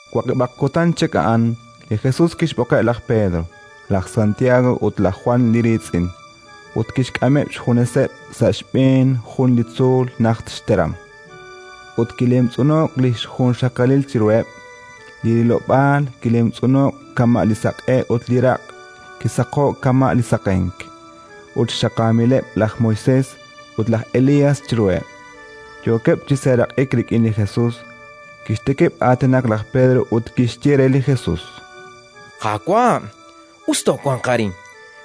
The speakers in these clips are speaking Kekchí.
Waqib'aq kutan chik a'an, li Jesus kixb'oqeb' laj Pedro, laj Santiago ut laj Jwan li riitz'in, ut kixk'ameb' xjuneseb' sa' xb'een jun li tzuul najt xteram. Ut kilemtz'uno'k li xjunxaqalil chiruheb': li rilob'aal kilemtz'uno'k kama' li saq'e ut li raq' kisaqo'k kama' li saqenk. Ut xaqaamileb' laj Moisés ut laj Elías chiruheb', yookeb' chi seeraq'ik rik'in li Jesus. Kixtikib' aatinak laj Pedro ut kixye re li Jesus: —Qaawa', us toowanq arin.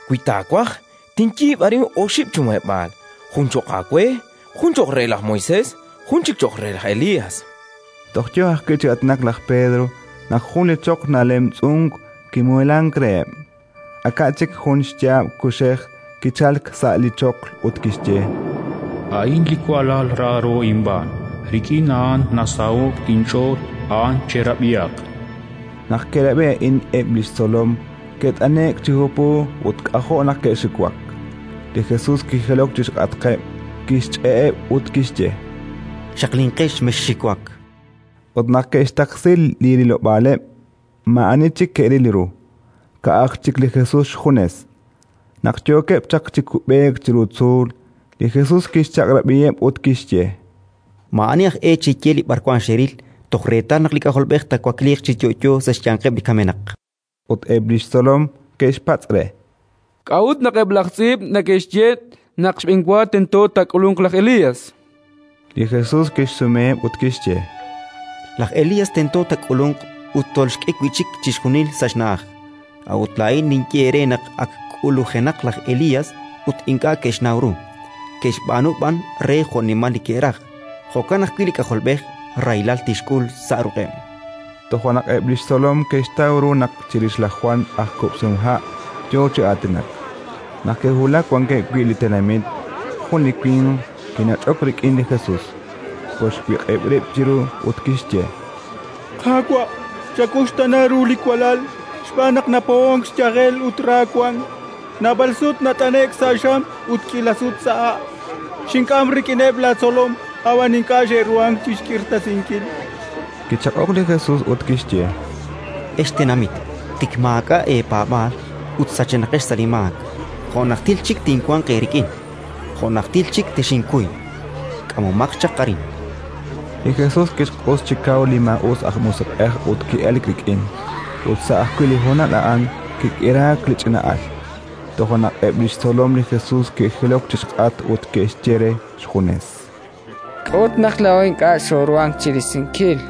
Wi taawaj, tinyiib' arin oxib' chi muheb'aal: jun cho'q aawe, jun cho'q re laj Moisés, jun chik cho'q re laj Elías. Toj yo ajwi' chi aatinak laj Pedro, naq jun li choql nalemtz'unk kimuheelank reheb'. Aka' chik jun xyaab' kuxej kichalk sa' li choql ut kixye: “A'in li walal raaro inb'aan. Rik'in a'an nasaho'k inch'ool: a'an cherab'ihaq”. Naq ke'rab'i a'in eb' li xtzolom, ke't'ane'k chi hupu ut k'ajo' naq ke'xiwak. Li Jesus kijilok chi xk'atqeb', kixch'e'eb' ut kixye: —Xaqlinqex, mexxiwak! Ut naq ke'xtaqsi li rilob'aaleb', maa'ani chik ke'ril ru, ka'aj chik li Jesus xjunes. Naq yookeb' chaq chi kub'eek chiru tzuul, li Jesus kixchaq'rab'iheb' ut kixye: —Maa'ani aj e cheye li b'arwan xeril toj reetal naq li K'ajolb'ej taawakliiq chi yo'yo sa' xyanqeb' li kamenaq. Ut eb' li xtzolom ke'xpatz' re: —K'a'ut naq eb' laj tz'iib' neke'xye naq xb'enwa tento taak'ulunq laj Elías? Li Jesus kixsumeheb' ut kixye: —Laj Elías tento taak'ulunq ut tolxk'e wi' chik chixjunil sa' xna'aj. A'ut laa'in ninye eere naq ak k'ulujenaq laj Elías ut ink'a' ke'xnaw ru, ke'xb'aanu b'an re jo'nimal li ke'raj. Jo'kan ajwi' li K'ajolb'ej rahilal tixk'ul sa' ruq'eb'. Toja' naq eb' li xtzolom ke'xtaw ru naq chirix laj Jwan aj kub'sihomha' yo chi aatinak. Naq ke'wulak wankeb' wi' li tenamit, jun li winq kinach'ok rik'in li Jesus, kolxwiq'ib' rib' chiru ut kixye: —Qaawa', chawuxtaana ru li walal xb'aan naq napohonk xyajel ut ra wank; naab'al sut nat'ane'k sa' xam ut k'iila sut sa' ha'. Xink'am rik'ineb' laatzolom, ab'an ink'a' xe'ruhank chi xk'irtasinkil. Kichaq'ok li Jesus ut kixye: —Ex tenamit tik maak'a' eepaab'aal ut sachenaqex sa' li maak, jo' najtil chik tinwanq eerik'in? Jo' najtil chik texinkuy? K'amomaq chaq arin. Li Jesus kixq'us chi kaw li maa'us aj musiq'ej ut ki'elk rik'in. Ut sa' ajwi' li honal a'an kik'iraak li ch'ina'al. Toja' naq eb' li xtzolom li Jesus ke'jilok chi xk'atq ut ke'xye re xjunes: —K'a'ut naq laa'o ink'a' xooruhank chi risinkil?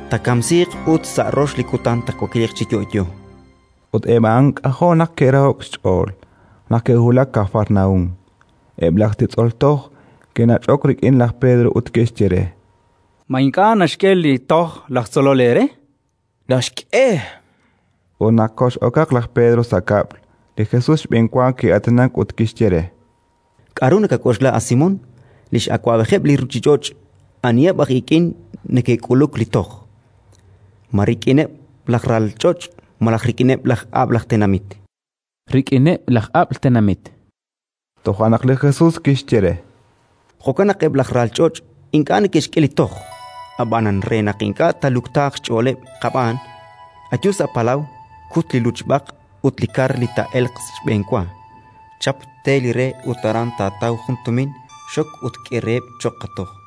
taakamsiiq ut sa' rox li kutan taawakliiq chi yo'yo. Ut eb' a'an k'ajo' naq ke'raho'k xch'ool. Naq ke'wulak Kafarnaúm, eb' laj titz'ol toj ke'nach'ok rik'in laj Pedro ut ke'xye re: —Ma ink'a' naxk'e li toj laj tzolol eere? —Naxk'e, chan laj Pedro. Ut naq kox'okaq laj Pedro sa' kab'l, li Jesus xb'enwa ki'aatinak ut kixye re: —K'aru nakak'oxla, a Simón? Li x'awab'ejeb' li ruuchich'och' aniheb' aj ik'in neke'k'uluk li toj? Ma rik'ineb' laj ral ch'och' malaj rik'ineb' laj ab'l tenamit? —Rik'ineb' laj ab'l tenamit, chan laj Pedro. Toja' naq li Jesus kixye re: —Jo'kan naq eb' laj ral ch'och' ink'a' neke'xk'e li toj. Ab'anan, re naq ink'a' taaluktaaq xch'ooleb' qab'aan, ayu sa' palaw, kut li luchb'aq, ut li kar li taa'elq xb'enwa, chap, te li re ut aran taataw jun tumin: xok ut k'e reheb' cho'q qatoj.